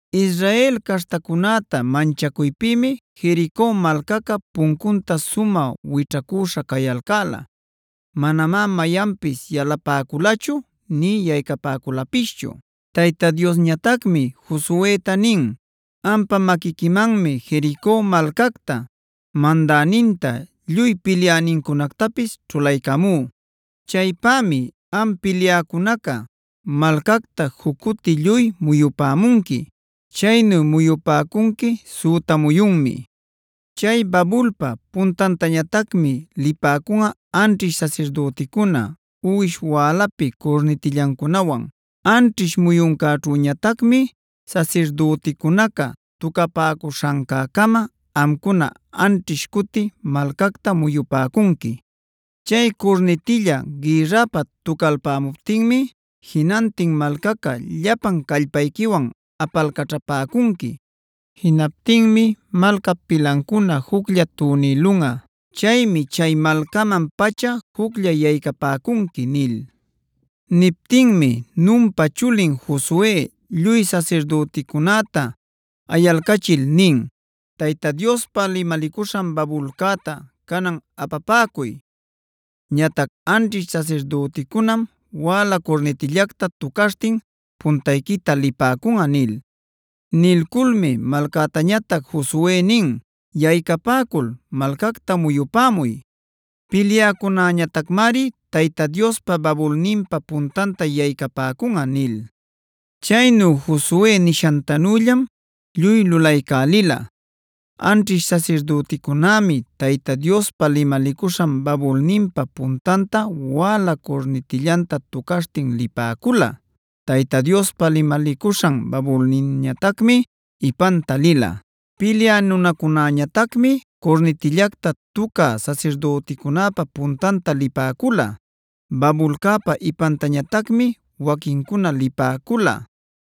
Israel caśhtacunäta manchacuypïmi Jerico malcaca puncunta sumä wićhacüśha cayalcäla. Manamá mayanpis yalapäculachu nï yaycapäculapischu. Tayta Diosñatacmi Josueta nin: “Ampa maquiquimanmi Jerico malcacta, mandäninta, lluy pilyänincunactapis ćhulaycamú. Chaypämi am pilyäcunaca malcacta juc cuti lluy muyupämunqui. Chaynu muyupäcunqui süta muyunmi. Chay Babulpa puntantañatacmi lipäcunꞌa anćhish sasirdüticuna uwish wälapi curnitillancunawan. Anćhish muyuncäćhüñatacmi sasirdüticunaca tucapäcuśhancäcama amcuna anćhish cuti malcacta muyupäcunqui. Chay curnitilla gïrrapä tucalpämuptinmi jinantin malcaca llapan callpayquiwan apalcaćhapäcunqui. Jinaptinmi malcap pilancuna juclla tunïlunꞌa. Chaymi chay malcaman-pacha juclla yaycapäcunqui” nil. Niptinmi Nunpa chulin Josue lluy sasirdüticunäta ayalcachil nin: “Tayta Diospa limalicuśhan babulcäta canan apapäcuy. Ñatac anćhish sasirdüticunam wäla curnitillacta tucaśhtin puntayquita lipäcunꞌa” nil. Nilculmi malcätañatac Josue nin: “Yaycapäcul, malcacta muyupämuy. Pilyäcunäñatacmari Tayta Diospa babulninpa puntanta yaycapäcunꞌa” nil. Chaynu Josue nishantanüllam lluy lulaycälila. Anćhish sasirdüticunämi Tayta Diospa limalicuśhan babulninpa puntanta wäla curnitillanta tucaśhtin lipäcula. Tayta Diospa limalicuśhan babulninñatacmi ipanta lila. Pilyä nunacunäñatacmi curnitillacta tucä sasirdüticunäpa puntanta lipäcula. Babulcäpa ipantañatacmi waquincuna lipäcula;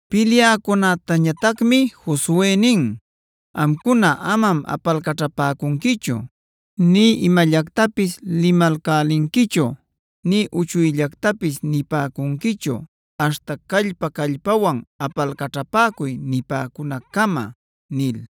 Pilyäcunätañatacmi Josue nin: “Amcuna amam apalcaćhapäcunquichu, nï imallactapis limalcälinquichu, nï uchuyllactapis nipäcunquichu aśhta ‘callpa-callpawan apalcaćhapäcuy’ nipäcunaccama” nil.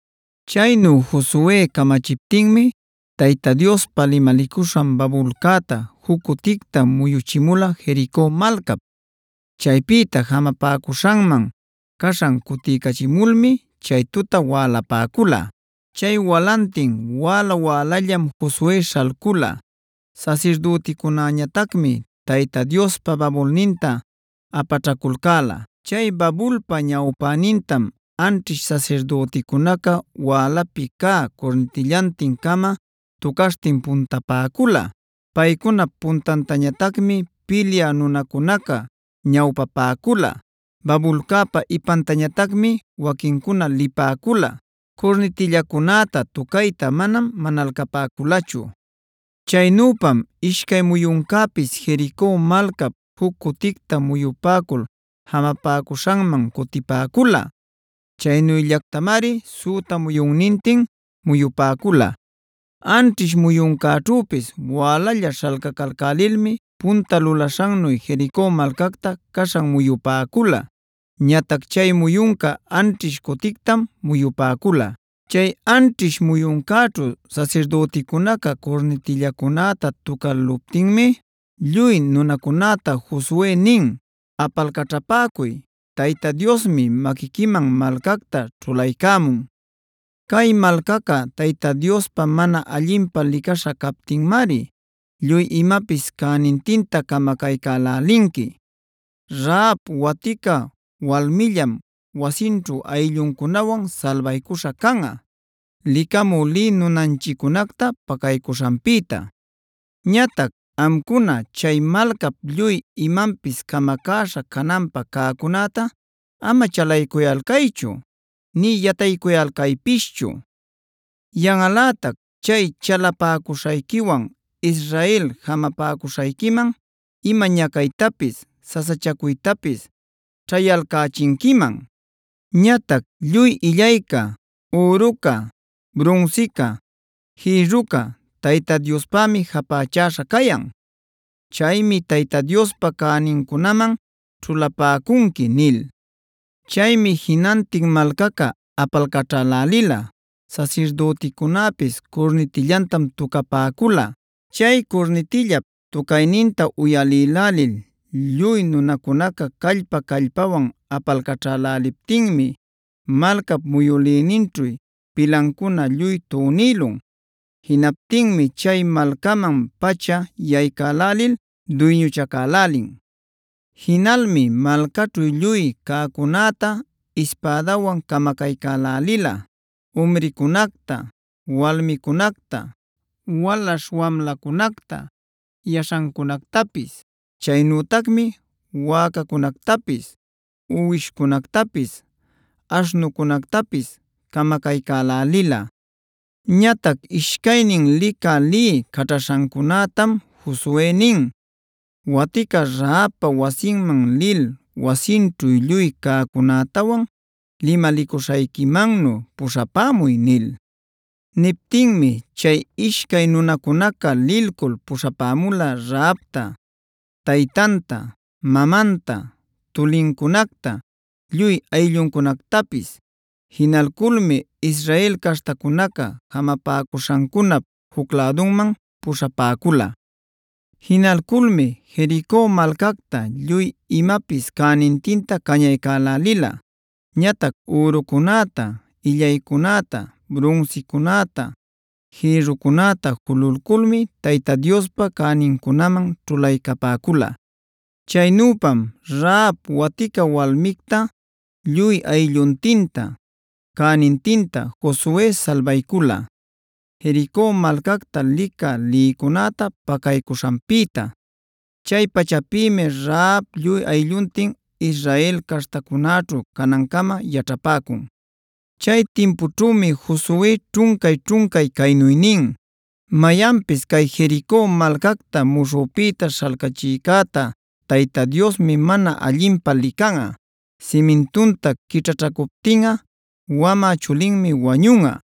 Chaynu Josue camachiptinmi Tayta Diospa limalicuśhan babulcäta juc cuticta muyuchimula Jerico malcap. Chaypïta jamapäcuśhanman caśhan cutiycachimulmi chay tuta wälapäcula. Chay walantin wäla-wälallam Josue śhalcula; sasirdüticunäñatacmi Tayta Diospa babulninta apaćhaculcäla. Chay babulpa ñawpänintam anćhish sasirdüticunaca wälapi cä curnitillantin-cama tucaśhtin puntapäcula. Paycunap puntantañatacmi pilyä nunacunaca ñawpapäcula. Babulcäpa ipantañatacmi waquincuna lipäcula. Curnitillacunäta tucayta manam manalcapäculachu. Chaynüpam ishcay muyuncäpis Jerico malcap juc cuticta muyupäcul jamapäcuśhanman cutipäcula. Chaynüllatacmari süta muyunnintin muyupäcula. Anćhish muyuncäćhüpis wälalla śhalcacalcälilmi punta lulaśhannu Jerico malcacta caśhan muyupäcula. Ñatac chay muyunca anćhish cutictam muyupäcula. Chay anćhish muyuncäćhu sasirdüticunaca curnitillacunäta tucäluptinmi lluy nunacunäta Josue nin: “¡Apalcaćhapäcuy! ¡Tayta Diosmi maquiquiman malcacta ćhulaycämun! Cay malcaca Tayta Diospa mana allinpä licaśha captinmari lluy imapis cänintinta camacaycälälinqui.c Rahab waticab walmillam, wasinćhu aylluncunawan salbaycuśha canꞌa, licamü lï nunanchiccunacta pacaycuśhanpïta. Ñatac amcuna chay malcap lluy imanpis camacäśha cananpä cäcunäta ama chalaycuyalcaychu nï yataycuyalcaypischu. Yanꞌalätac chay chalapäcuśhayquiwan Israel jamapäcuśhayquiman ima ñacaytapis, sasachacuytapis ćhäyalcächinquiman. Ñatac lluy illayca, üruca, brunsica, jïrruca Tayta Diospämi japächäśhä cayan. Chaymi Tayta Diospa cänincunaman ćhulapäcunqui” nil. Chaymi jinantin malcaca apalcaćhälälila, sasirdüticunäpis curnitillantam tucapäcula. Chay curnitillap tucayninta uyalïlälil lluy nunacunaca callpa-callpawan apalcaćhäläliptinmi malcap muyülïninćhu pilancuna lluy tunïlun.d Jinaptinmi chay malcaman-pacha yaycälälil duyñuchacälälin. Jinalmi malcaćhu lluy cäcunäta ispädawan camacaycälälila: umricunacta, walmicunacta, walaśh wamlacunacta, yaśhancunactapis.e Chaynütacmi wäcacunactapis, uwishcunactapis, aśhnucunactapis camacaycälälila. Ñatac ishcaynin licä lï caćhaśhancunätam Josue nin: “Watica Rahabpa wasinman lil wasinćhu lluy cäcunätawan limalicuśhayquimannu puśhapämuy” nil. Niptinmi chay ishcay nunacunaca lilcul puśhapämula Rahabta, taytanta, mamanta, tulincunacta, lluy aylluncunactapis. Jinalculmi Israel caśhtacunaca jamapäcuśhancunap juc lädunman puśhapäcula. Jinalculmi Jerico malcacta lluy imapis cänintinta cañaycälälila. Ñatac ürucunäta, illaycunäta, brunsicunäta, jïrrucunäta jululculmi Tayta Diospa cänincunaman ćhulaycapäcula. Chaynüpam Rahab watica walmicta lluy aylluntinta, cänintinta Josue salbaycula, Jerico malcacta licä lïcunäta pacaycuśhanpïta.f Chay pachapïmi Rahab lluy aylluntin Israel caśhtacunäćhu canancama yaćhapäcun. Chay timpućhümi Josue ćhuncay-ćhuncay caynu nin: “Mayanpis cay Jerico malcacta muśhüpïta śhalcachïcäta Tayta Diosmi mana allinpä licanꞌa. Simintunta quićhaćhacuptinꞌa wamä chulinmi wañunꞌa;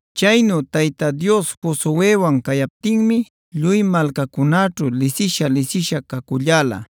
Chaynu Tayta Dios Josuewan cayaptinmi lluy malcacunäćhu lisisha-lisisha caculläla.